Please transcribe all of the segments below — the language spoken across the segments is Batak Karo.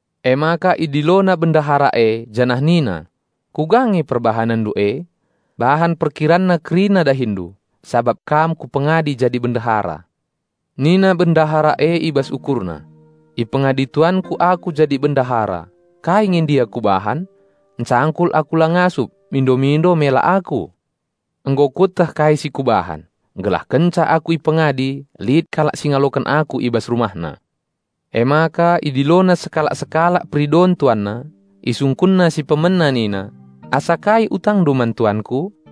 Emaka idilona bendahara e janah nina, 'Kuga nge perbahanenndu e? Bahan perkiranna kerina dahindu, sabap kam kupengadi jadi bendahara.' Nina bendahara e i bas ukurna, 'Ipengadi tuanku aku jadi bendahara, kai nge ndia kubahan? Ncangkul la aku ngasup, mindo-mindo mela aku. Nggo kueteh kai si kubahan, gelah kenca aku ipengadi lit kalak si ngaloken aku i bas rumahna.' Emaka idilona sekalak-sekalak peridon tuanna. Isungkunna si pemena nina, 'Asa kai utangndu man tuanku?'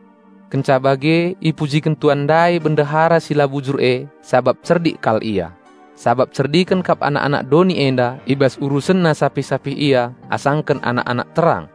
Kenca bage ipujiken tuan ndai bendahara si la bujur e sabap cerdik kal ia; sabap cerdiken kap anak-anak doni enda i bas urusenna sapih-sapih ia asangken anak-anak terang."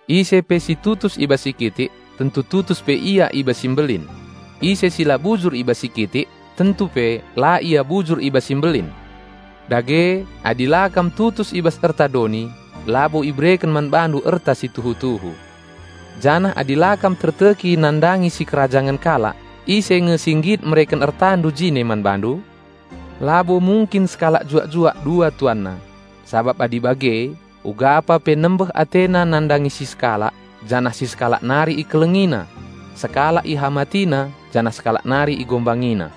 "Ise pe situtus i bas si kitik, tentu tutus pe ia i bas si mbelin; ise si la bujur i bas si kitik, tentu pe la ia bujur i bas si mbelin. Dage, adi la kam tutus i bas erta doni, labo ibereken man bandu erta si tuhu-tuhu. Janah adi la kam terteki nandangi sikerajangen kalak ise nge si nggit mereken ertandu jine man bandu? Labo mungkin sekalak juak-juak dua tuanna. Sabap adi bage ugapa pe nembeh atena nandangi si sekalak janah si sekalak nari ikelengina; sekalak ihamatina janah sekalak nari ihinana.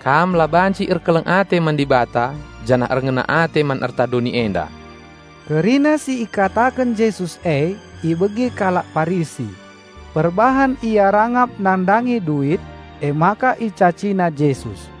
Kam la banci erkeleng ate man Dibata janah erngena ate man erta doni enda." Kerina si ikataken Jesus e ibegi kalak Parisi; perbahan ia rangap nandangi duit, emaka icacina Jesus.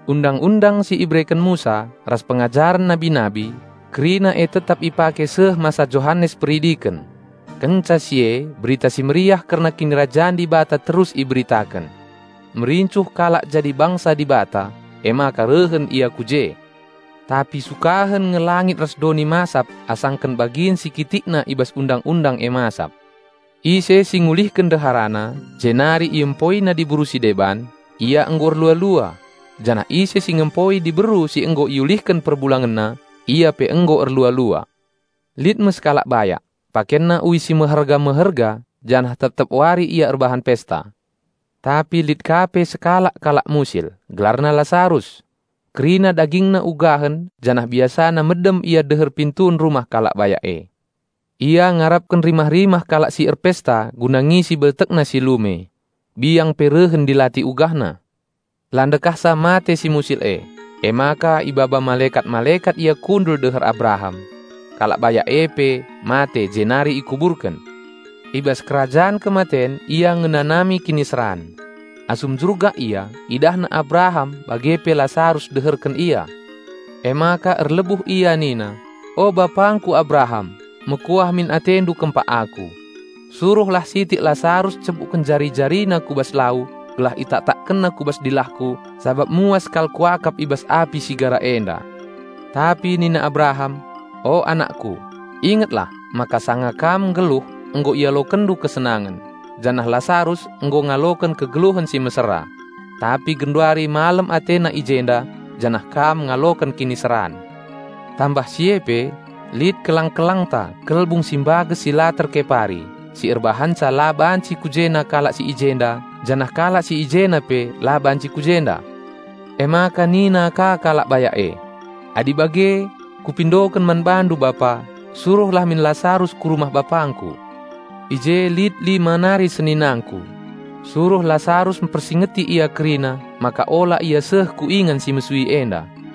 "Undang-undang si ibereken Musa, ras pengajaren nabi-nabi, kerina e tetap ipake seh masa Johanes Peridiken. Kenca si e Berita Si Mehuli kerna Kinirajan Dibata terus iberitaken. Merincuh kalak jadi bangsa Dibata, emaka rehen ia ku je. Tapi sukahen nge langit ras doni masap asangken bagin si kitikna i bas Undang-undang e masap. Ise si ngulihken ndeharana, jenari iempoina diberu si deban, ia nggo erlua-lua; janah ise si ngempoi diberu si nggo iulihken perbulangenna, ia pe nggo erlua-lua." "Lit me sekalak bayak; pakenna uis si meherga-meherga janah tep-tep wari ia erbahan pesta. Tapi lit ka pe sekalak kalak musil, gelarna Lasarus. Kerina dagingna ugahen janah biasana medem ia deher pintun rumah kalak bayak e. Ia ngarapken rimah-rimah kalak si erpesta guna ngisi beltekna si lume. Biang pe rehen ndilati ugahna. La ndekahsa mate si musil e, emaka ibaba malekat-malekat ia kundul deher Abraham. Kalak bayak e pe mate jenari ikuburken. I bas kerajan kematen ia ngenanami kiniseran. Asum jurgak ia idahna Abraham bage pe Lasarus deherken ia. Emaka erlebuh ia nina, 'O bapangku Abraham! Mekuah min atendu kempak aku. Suruhlah sitik Lasarus ncebukken jari-jarina ku bas lau gelah itaktakkenna ku bas dilahku sabap muas kal kuakap i bas api si gara enda.' Tapi nina Abraham, 'O anakku, ingetlah maka sanga kam nggeluh nggo ialokenndu kesenangen, janah Lasarus nggo ngaloken kegeluhen si mesera. Tapi genduari malem atena i jenda, janah kam ngaloken kiniseran. Tambah si e pe, lit kelang-kelangta kelbung si mbages si la terkepari, si erbahanca la banci ku jena kalak si i jenda janah kalak si i jena pe la banci ku jenda.' Emaka nina ka kalak bayak e, 'Adi bage, kupindoken man bandu bapa, suruhlah min Lasarus ku rumah bapangku. I je lit lima nari seninangku. Suruh Lasarus mpersingeti ia kerina, maka ola ia seh ku ingan si mesui enda.'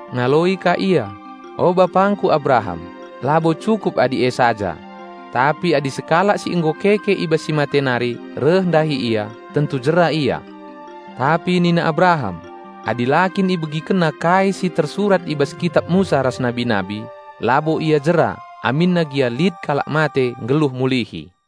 Ngaloi ka ia, 'O bapangku Abraham, labo cukup adi e saja. Tapi adi sekalak si nggo keke i bas si mate nari reh ndahi ia, tentu jera ia.' Tapi nina Abraham, 'Adi la kin ibegikenna kai si tersurat i bas kitap Musa ras nabi-nabi, labo ia jera aminna gia lit kalak mate nggeluh mulihi.'"